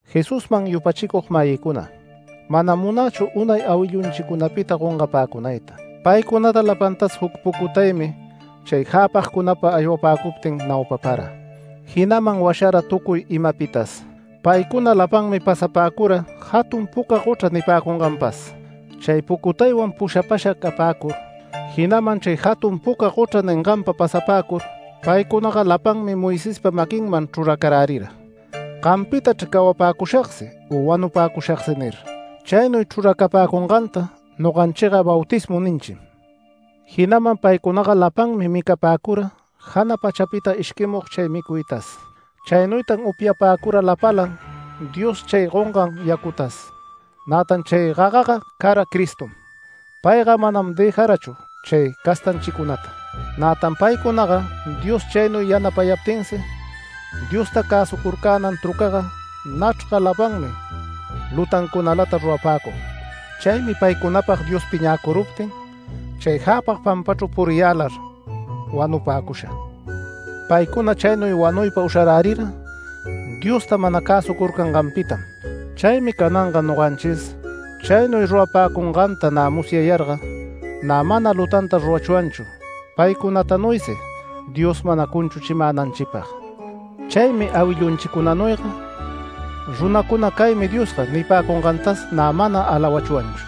Jesusman yupachicug-mayïcuna, manam munächu unay awillunchicunapita gongapäcunayta. Paycunata lapantas juc pucutaymi chay jäpagcunapa aywapäcuptin naupapara, jinaman washara tucuy imapitas. Paycuna lapanmi pasapäcura jatun puca gochra nipäcunganpas. Chay pucutaywan pushapasha capäcur, jinaman chay jatun puca gochra ninganpa pasapäcur, paycunaga lapanmi Moisespa maquinman chruracarärira “Gampitachr cawapäcushagsi u wanupäcushagsi” nir. Chaynuy chruracapäcunganta noganchiga bautismu ninchim. Jinaman paycunaga lapalanmi micapäcura jana pachapita ishquimug chay micuytas. Chaynuytan upyapäcura lapalan Dios chay gongan yacutas. Nätan chay gagaga cara Cristom. Payga manam dëjarachu chay castanchicunata. Nätan paycunaga Dios chaynuy yanapayaptinsi, Diosta cäsucurcänan trucaga nachrga lapanmi lutancunalata rurapäcug. Chaymi paycunapag Dios piñäcuruptin chay jäpag pampachru puriyälar wanupäcusha. Paycuna chaynuy wanuypa usharärira Diosta mana cäsucurcanganpitam. Chaymi cananga noganchis chaynuy rurapäcunganta nä musyayarga. Nä mana lutanta rurachwanchu, paycunatanuysi Dios mana cunchuchimänanchipag. Chaymi awillunchicunanuyga runacuna “Caymi diosga” nipäcungantas nä mana alawachwanchu.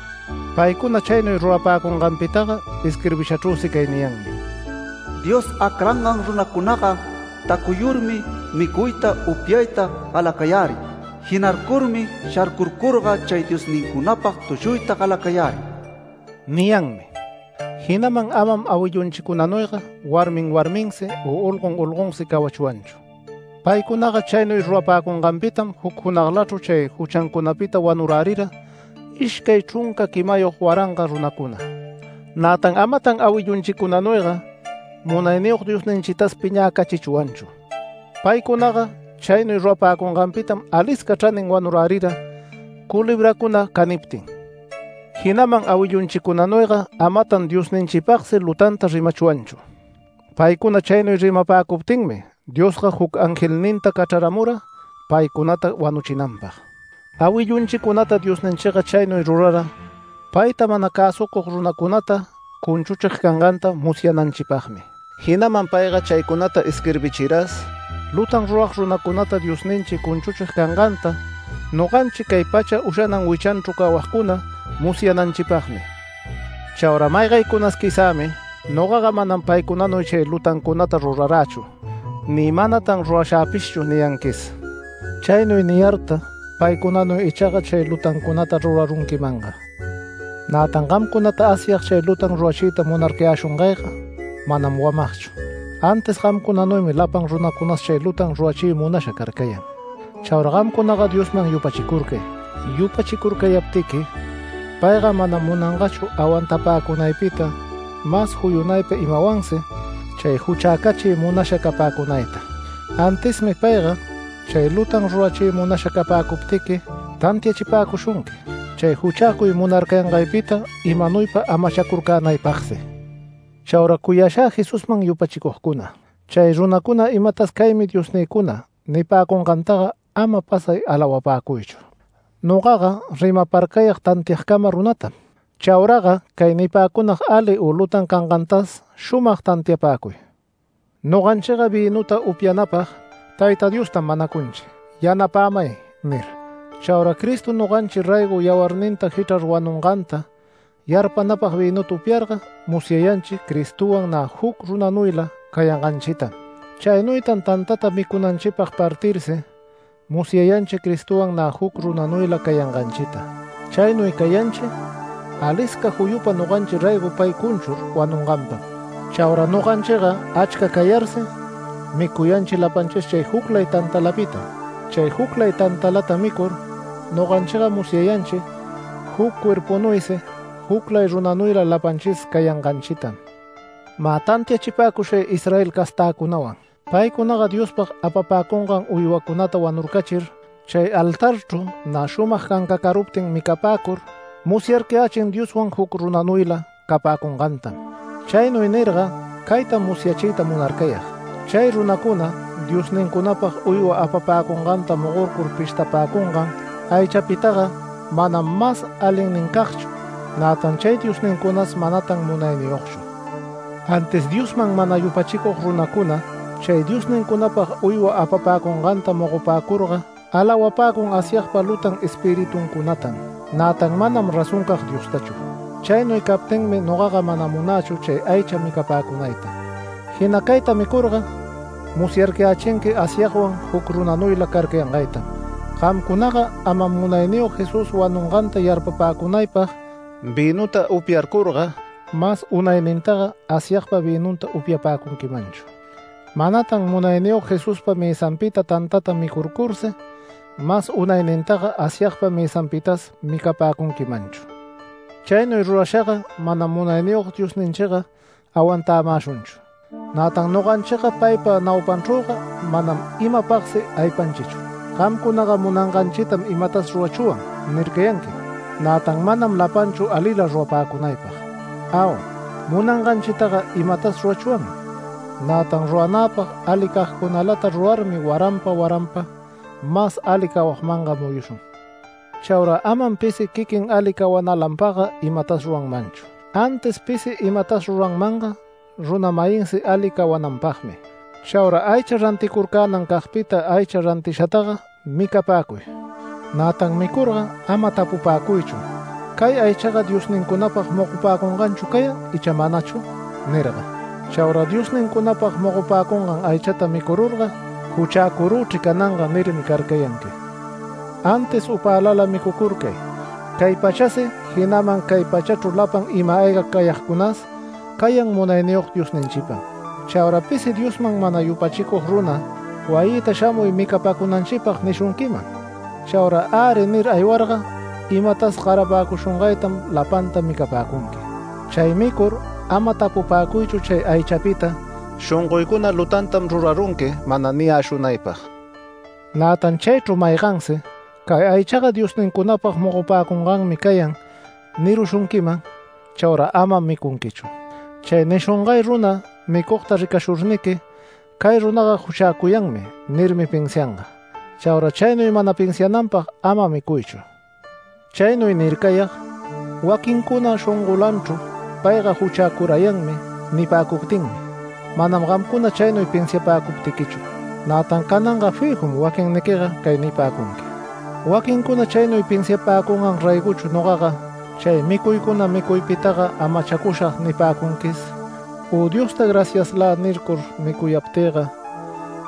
Paycuna chaynuy rurapäcunganpitaga isquirbishachrüsi cay niyanmi: “Dios acrangan runancunaga tacuyurmi micuyta upyayta galacayärin. Jinarcurmi sharcurcurga chay ‘diosnincunapag’ tushuyta galacayärin” niyanmi. Jinaman amam awillunchicunanuyga warmin warminsi u olgon olgonsi cawachwanchu. Paycunaga chaynuy rurapäcunganpitam juc junaglachru chay juchancunapita wanurärira ishcay chrunca quimayog waranga runacuna. Nätan amatan awillunchicunanuyga Munayniyog Diosninchitas piñäcachichwanchu. Paycunaga chaynuy rurapäcunganpitam alisca chranin wanurärira culebracuna caniptin. Jinaman awillunchicunanuyga amatan Diosninchipagsi lutanta rimachwanchu. Paycuna chaynuy rimapäcuptinmi Diosga juc angelninta cachraramura paycunata wanuchinanpag. Awillunchicunata Diosninchiga chaynuy rurara, payta mana cäsucug runacunata cunchuchig canganta musyananchipagmi. Jinaman payga chaycunata isquirbichiras, lutan rurag runacunata Diosninchi cunchuchig canganta, noganchi cay pacha ushanan wichanchru cawagcuna musyananchipagmi. Chaura maygaycunas quizämi “Nogaga manam paycunanuy chay lutancunata rurarächu ni manatan rurashäpishchu” niyanquis. Chaynuy niyarta paycunanuy ichaga chay lutancunata rurarunquimanga. Nätan gamcunata Asyag chay lutan rurachiyta munarcayäshungayga manam wamagchu, antis gamcunanuymi lapan runacunas chay lutan rurachiy munasha carcayan. Chaura gamcunaga Diosman yupachicurcay. Yupachicurcayaptiqui payga manam munangachu awantapäcunaypita mas juyunaypa imawansi chay juchäcachiy munasha capäcunayta. Antismi payga chay lutan rurachiy munasha capäcuptiqui tantiachipäcushunqui, chay juchäcuy munarcayangaypita imanuypa amachacurcänaypagsi. Chaura cuyashä Jesusman yupachicugcuna, chay runacuna imatas “Caymi diosnïcuna” nipäcungantaga ama pasay alawapäcuychu. Nogaga rimaparcayag tantiagcama runatam. Chauraga cay nipäcunag ali u lutan cangantas shumag tantiapäcuy. Noganchiga vïnuta upyanapag Tayta Diostam manacunchi “Yanapämay” nir. Chaura Cristo noganchi raygo yawarninta jichrar wanunganta yarpanapag vïnuta upyarga musyayanchi Cristowan nä juc runanuyla cayanganchitam. Chaynuytan tantata micunanchipag partirsi musyayanchi Cristowan nä juc runanuyla cayanganchita. Chaynuy cayanchi alisca juyupa noganchi raygo pay cunchur wanunganpam. Chaura noganchiga achca cayarsi, micuyanchi lapanchis chay juclay tantalapitam. Chay juclay tantalata micur noganchiga musyayanchi juc cuerpunuysi juclay runanuyla lapanchis cayanganchitam. Mä, tantiachipäcushay Israel castäcunawan; paycunaga Diospag apapäcungan uywacunata wanurcachir chay altarchru nä shumag cancacaruptin micapäcur musyarcayächin, Dioswan juc runanuyla capäcungantam. Chaynuy nirga caytam musyachiyta munarcayag; chay runacuna diosnincunapag uywa apapäcunganta mogorcur pishtapäcungan aychapitaga manam mas alinnincagchu, nätan chay diosnincunas manatan munayniyogchu. Antis Diosman mana yupachicug runacuna chay diosnincunapag uywa apapäcunganta mogopäcurga alawapäcun Asyagpa lutan espirituncunatam, nätan manam razoncag Diostachu. Chaynuy captinmi nogaga mana munächu chay aycha micapäcunayta. Jina cayta micurga musyarcayächinqui Asyagwan juc runanuyla carcayangaytam. Gamcunaga manam Munayniyog Jesús wanunganta yarpapäcunaypag vïnuta upyarcurga, mas unaynintaga Asyagpa vïnunta upyapäcunquimanchu. Manatan Munayniyog Jesuspa mësanpita tantata micurcursi, mas unaynintaga Asyagpa mësanpitas micapäcunquimanchu. Chaynuy rurashaga manam Munayniyog Diosninchiga awantämäshunchu. Nätan noganchiga paypa naupanchrüga manam imapagsi aypanchichu. Gamcunaga “Munanganchitam imatas rurachwan” nircayanquim, nätan manam lapanchu alila rurapäcunaypag. Au. Munanganchitaga imatas rurachwanmi, nätan ruranäpag alicagcunalata rurarmi waranpa, waranpa mas ali cawagmanga muyushun. Chaura amam pisi quiquin ali cawanalanpagga imatas ruranmanchu, antis pisi imatas ruranmanga runa-mayinsi ali cawananpagmi. Chaura aycha ranticurcänancagpita aycha rantishataga micapäcuy. Nätan micurga ama tapupäcuychu “¿Cay aychaga diosnincunapag mogopäcunganchu cayan icha manachu?” nirga. Chaura diosnincunapag mogopäcungan aychata micururga “Juchäcurüchri cananga” nirmi carcayanqui. Antis upälala micucurcay cay pachasi, jinaman cay pachachru lapan ima-ayga cayagcunas cayan Munayniyog Diosninchipam. Chaura pisi Diosman mana yupachicug runa “Wayïta shamuy micapacunanchipag” nishunquiman. Chaura “Äri” nir aywarga, imatas garapäcushungaytam lapanta micapäcunqui. Chay micur ama tapupapäcuychu chay aychapita, shongoycuna “Lutantam rurarunqui” mana niyäshunaypag. Nätan chaychru maygansi “Cay aychaga diosnincunapag mogopäcunganmi cayan” nirushunquiman, chauraga amam micunquichu. Chay nishungay runaga micugta ricashurniqui “Cay runaga juchäcuyanmi” nirmi pinsianga. Chaura chaynuy mana pinsiananpag ama micuychu. Chaynuy nircayag: Waquincuna shongolanchru “Payga juchäcurayanmi” nipäcuptinmi, manam gamcuna chaynuy pinsiapäcuptiquichu. Nätan cananga fijum waquinniquiga cay nipäcunqui: “Waquincuna chaynuy pinsiapäcungan raygochu nogaga, chay micuycuna micuypitaga amachacushag” nipäcunquis. U Diosta “Graciaslä” nircur micuyaptïga,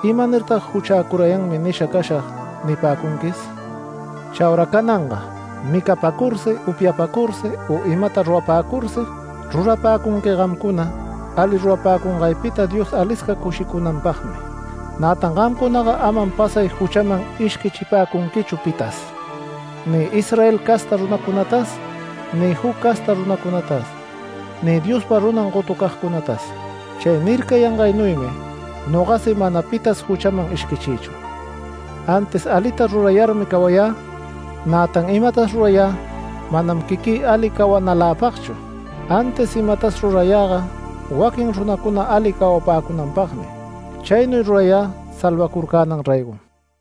¿imanirtag “Juchäcurayanmi nisha cashag” nipäcunquis? Chaura cananga micapäcursi upyapäcursi u imata rurapäcursi, rurapäcunqui gamcuna ali rurapäcungaypita Dios alisca cushicunanpagmi. Nätan gamcunaga amam pasay juchaman ishquichipäcunquichu pitas, ni Israel casta runacunatas, ni juc casta runacunatas, ni Diospa runam gotucagcunatas. Chay nircayangaynuymi nogasi mana pitas juchaman ishquichïchu, antis alita rurayarmi cawayä. Nätan imatas rurayä manam quiquï ali cawacunaläpagchu, antis imatas rurayäga waquin runacuna ali cawapäcunanpagmi. Chaynuy rurayä salvacurcänan raygom.